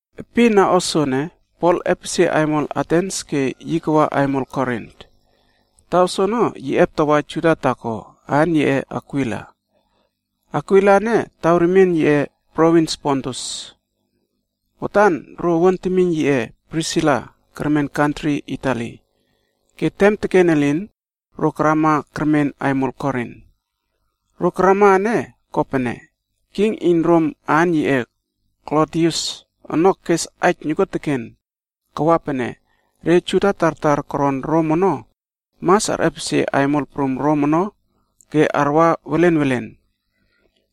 Epin na o soene, Pol epesie aimol Atens ke yi kawa aimol Korin. Taw soono yi eptawa Juda taako aan yiꞌe Akwila. Akwila ene taw remien yiꞌe provins Pontus. Watan, ro owuan temiyn yiꞌe Prisila kermen kantri Itali, ke tem teken elin, ro karama kermen aimol Korin. Ro karama ene kopene, king iyn Rom aan yiꞌe Klodius ono kes aij nokuoteken kawa pene re Juda tartar koron Rom ono mas arꞌepesie aimol prum Rom ono ke arwa welenwelen.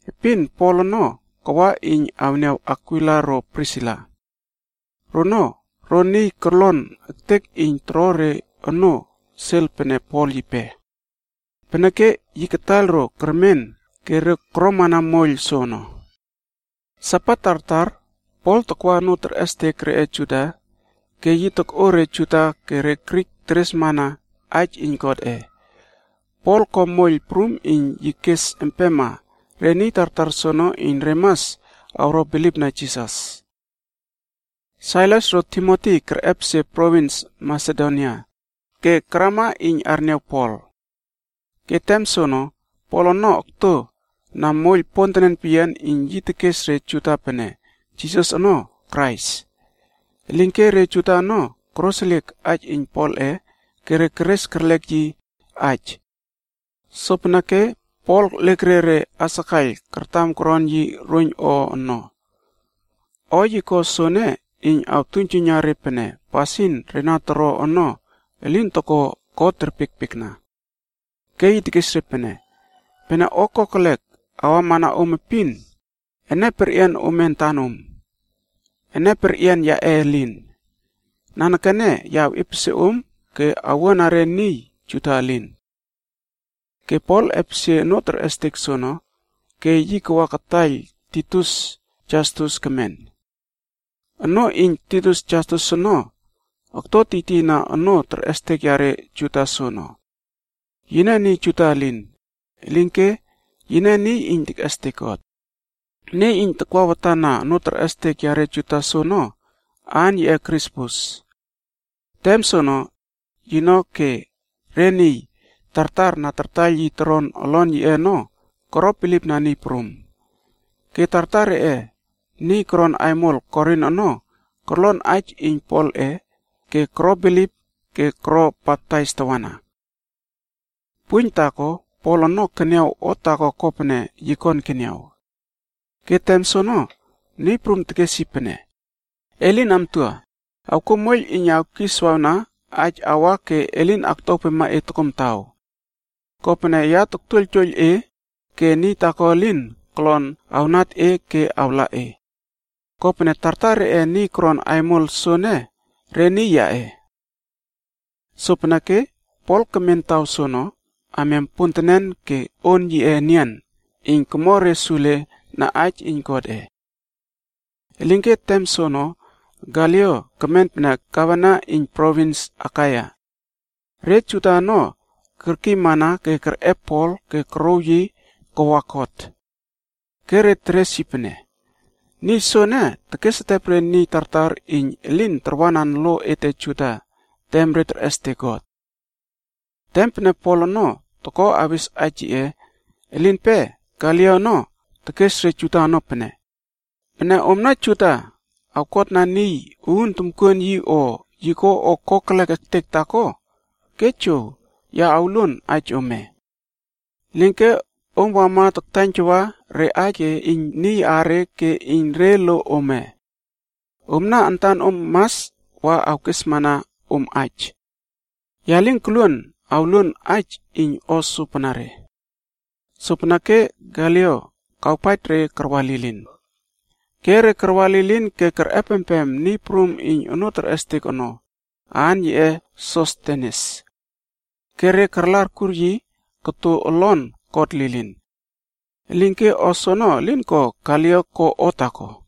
Epin Pol ono kawa iyn awniaw Akwila ro Prisila. Rono ro niy korlon ektek iyn toro re onoo sel pene Pol yipe. Peneke yi kataiyl ro kemen ke re koromana moiyl soono. Sabat tartar, Pol takwa onoo terꞌestek reꞌe Juda ke yi tokꞌo re Juda ke re Grik teresresna aij iyn Godꞌe. Pol ko moiyl prum iyn yi kes empema re niy tartar soono iyn re mas awro bilipna Jisas. Sailas ro Timoti kerꞌepesie provins Masedonia, ke karama iyn arniaw Pol. Ke tem soono, Pol ono okto na moiyl pontenen peyian iyn yi tekes re Juda pene Jisas ono Krais. Elinke re Juda ono koroseliek aij iyn Polꞌe ke re keres kerlek yi aij. Sopeneke Pol lekerie re asakaiyl kartam koron yi roiyn o ono. O yi ko soene iyn awtuiynjuiyna re pene pasin re na toro ono elin toko God terpiekpiekna. Ke yi tekes re pene, “Pene o kokelek awamana om epin, ene perꞌian ome antanom. Ene perꞌian yaꞌe elin. Nanekene ya awꞌepesie om ke owuana re niy Juda elin.” Ke Pol epesie onoo terꞌestek soono ke yi wa kataiyl niy taako, aan yiꞌe Titius Jastus, kemen. Onoo iyn Titius Jastus ono okto tiytiyna onoo terꞌestek yare Juda soono. Yine niy Juda elin, elinke yine niy iyn tekꞌestek God. Niy iyn takwa watan na onoo terꞌestek yare Juda soono, aan yiꞌe Krispus. Tem soono, yino ke re niy tartar na tartaiyl yi toron olon yiꞌe ono koro bilipna Niy Prum. Ke tartar reꞌe niy koron aimol Korin ono korlon aij iyn Polꞌe ke koro bilip ke koro baptais tawana. Puiyn taako Pol ono keniaw o taako kopene yi kon keniaw. Ke tem soono, Niy Prum tekes yi pene, “Elin amtua, awkuo moiyl iyn awkiswawna aij awa ke elin aktuawpema e tokomtaw. Kopene ya toktuoiyltuoiyl e, ke niy taako elin kolon awnat e ke awla e. Kopene tartar reꞌe niy koron aimol soene re niy yaꞌe.” Sopeneke Pol kemen taw soono amiam pontenen ke on yiꞌe enian iyn komo re sule na aij iyn Godꞌe. Elinke tem soono Galio kemen Gavena iyn provins Akaia. Re Juda ono kerkiymana ke kerꞌep Pol ke korouw yi kawa kot. Ke re teres pene, “Niy soene tekesetep re niy tartar iyn elin tarwanan lo ete Juda tem re terꞌestek God.” Tem pene Pol ono toko awes aij yiꞌe, elinpe Galio ono tekes re Juda ono pene, “Pene omna Juda awkotna niy uun tomkuon yi o yi ko o kokelek ektek taako, ke jow, ya awluon aij ome. Elinke om wama ke taktaiyntawa re aij ke iyn niy aare ke iyn re lo ome. Omna antanom mas wa awkesmana om aij. Ya lin koluon awluon aij iyn o sopanare.” Sopeneke Galio kawpaij re karwa lilin. Ke re karwa lilin ke kerꞌepempem niy prum iyn onoo terꞌestek ono, aan yiꞌe Sostenes. Ke re karla arkur yi koto olon kot lilin. Elinke o soono elin ko Galio ko o taako.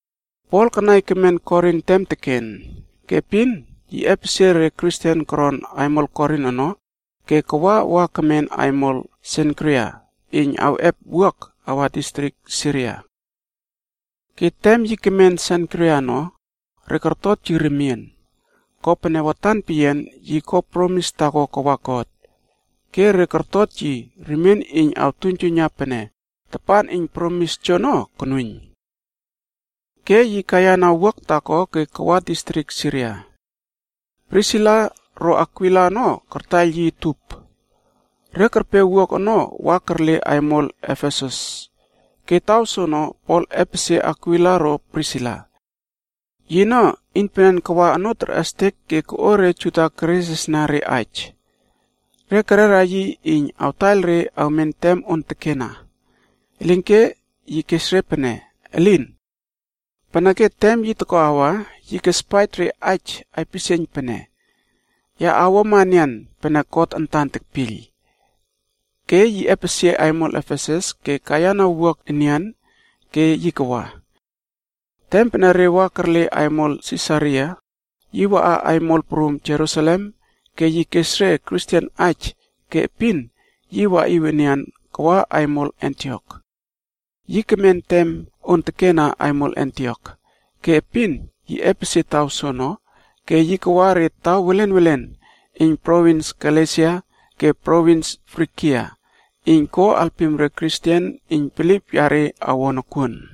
Pol kanai kemen Korin tem teken. Ke epin yi epesie re Kristen koron aimol Korin ono ke kawa wa kemen aimol Senkria iyn awꞌep wuak awa distrik Siria. Ke tem yi kemen Senkria ono, re kortot yi remien. Kopene, watan peyian yi ko promis taako kawa God. Ke re kortot yi remien iyn awtuiynjuiyna pene tapan iyn promis joono konuiyn. Ke yi kaiyana wuak taako ke kawa distrik Siria. Prisila ro Akwila ono kartaiyl yi utup. Re kerpe wuak ono wa kerle aimol Efesus, ke taw soono Pol epesie Akwila ro Prisila. Yino iynpenen kawa onoo terꞌestek ke koꞌo re Juda keresresna re aij. Re kerera yi iyn awtaiyl re awmen tem on tekena, elinke yi kes re pene, elin!. Peneke tem yi toko awa, yi kespaij re aij aipisieiyn pene, “Ya awuama enian pene God antan tekpiyl.” Ke yi epesie aimol Efesus ke kaiyana wuak enian ke yi kawa. Tem pene re wa kerle aimol Sisaria, yi waꞌa aimol prum Jerusalem ke yi kes re Kristen aij ke epin yi waꞌiw enian kawa aimol Antiok. Yi kemen tem on tekena aimol Antiok, ke epin yi epesie taw soono, ke yi kawa re taw welen welen iyn provins Galesia ke provins Frigia iyn ko alpim re Kristen iyn bilip yare awo nokuon.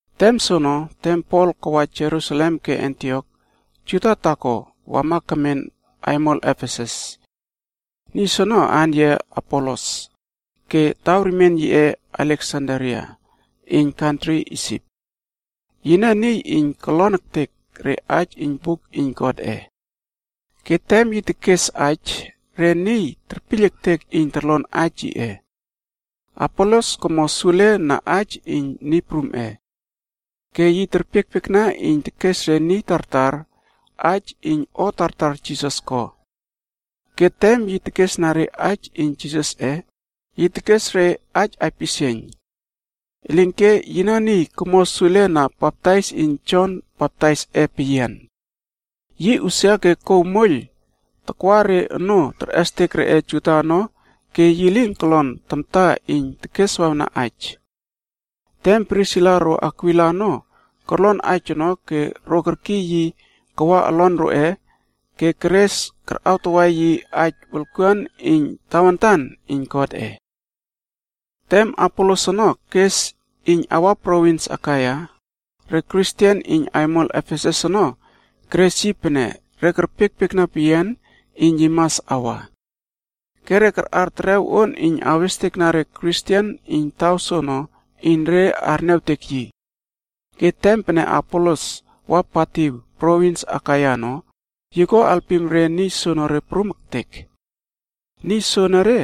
Tem soono, tem Pol kawa Jerusalem ke Antiok, Juda taako wama kemen aimol Efesus. Niy soono aan yiꞌe Apolos ke taw remien yiꞌe Aleksandria iyn kantri Isip. Yine niy iyn kolon ektek re aij iyn Buk iyn Godꞌe. Ke tem yi tekes aij, re niy terpiyl ektek iyn torlon aij yiꞌe. Apolos komo sule na aij iyn Niy Prumꞌe. Ke yi terpiekpiekna iyn yi tekes re niy tartar aij iyn o tartar Jisas ko. Ke tem yi tekesna re aij iyn Jisasꞌe, yi tekes re aij aipisieiyn. Elinke yino niy komo sule na baptais iyn Jon Baptaisꞌe peyian. Yi usia ke kouw moiyl takwa re onoo terꞌestek reꞌe Juda ono ke yi lin kolon tamta iyn tekeswawna aij. Tem Prisila ro Akwila ono, korlon aij ono ke ro kerkiy yi kawa olon roꞌe ke keres karꞌawtawa yi aij wolkuan iyn tawantan iyn Godꞌe. Tem Apolos ono kes iyn awa provins Akaia, re Kristen iyn aimol Efesus ono keres yi pene re kerpiekpiekna peyian iyn yi mas awa. Ke re karꞌar terew on iyn awestekna re Kristen iyn taw soono iyn re arniawtek yi. Ke tem pene Apolos wa patiw provins Akaia ono, yi ko alpim re niy soenere prum ektek. Niy soenere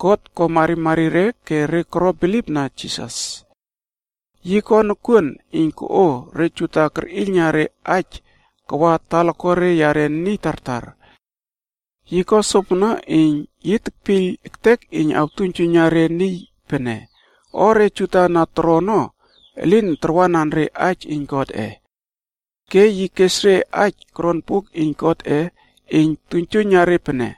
God ko marimari re ke re koro bilipna Jisas. Yi koto nokuoteken iyn koꞌo re Juda kerꞌiylna re aij kawa talakuare yare niy tartar ono. Yi ko sopono iyn yi kepiyl ektek iyn re temiynwuruaw tartar ono mas arniawpaij pene o re Juda na toro ono, elin tarwanan Aij iyn Godꞌe. yi kespaij re aij na koron Buk iyn Godꞌe ono terespaij pene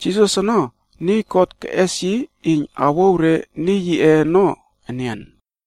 Jisas ono Krais ke niy God antan keꞌes yi iyn awouw re niy yiꞌe ono enian.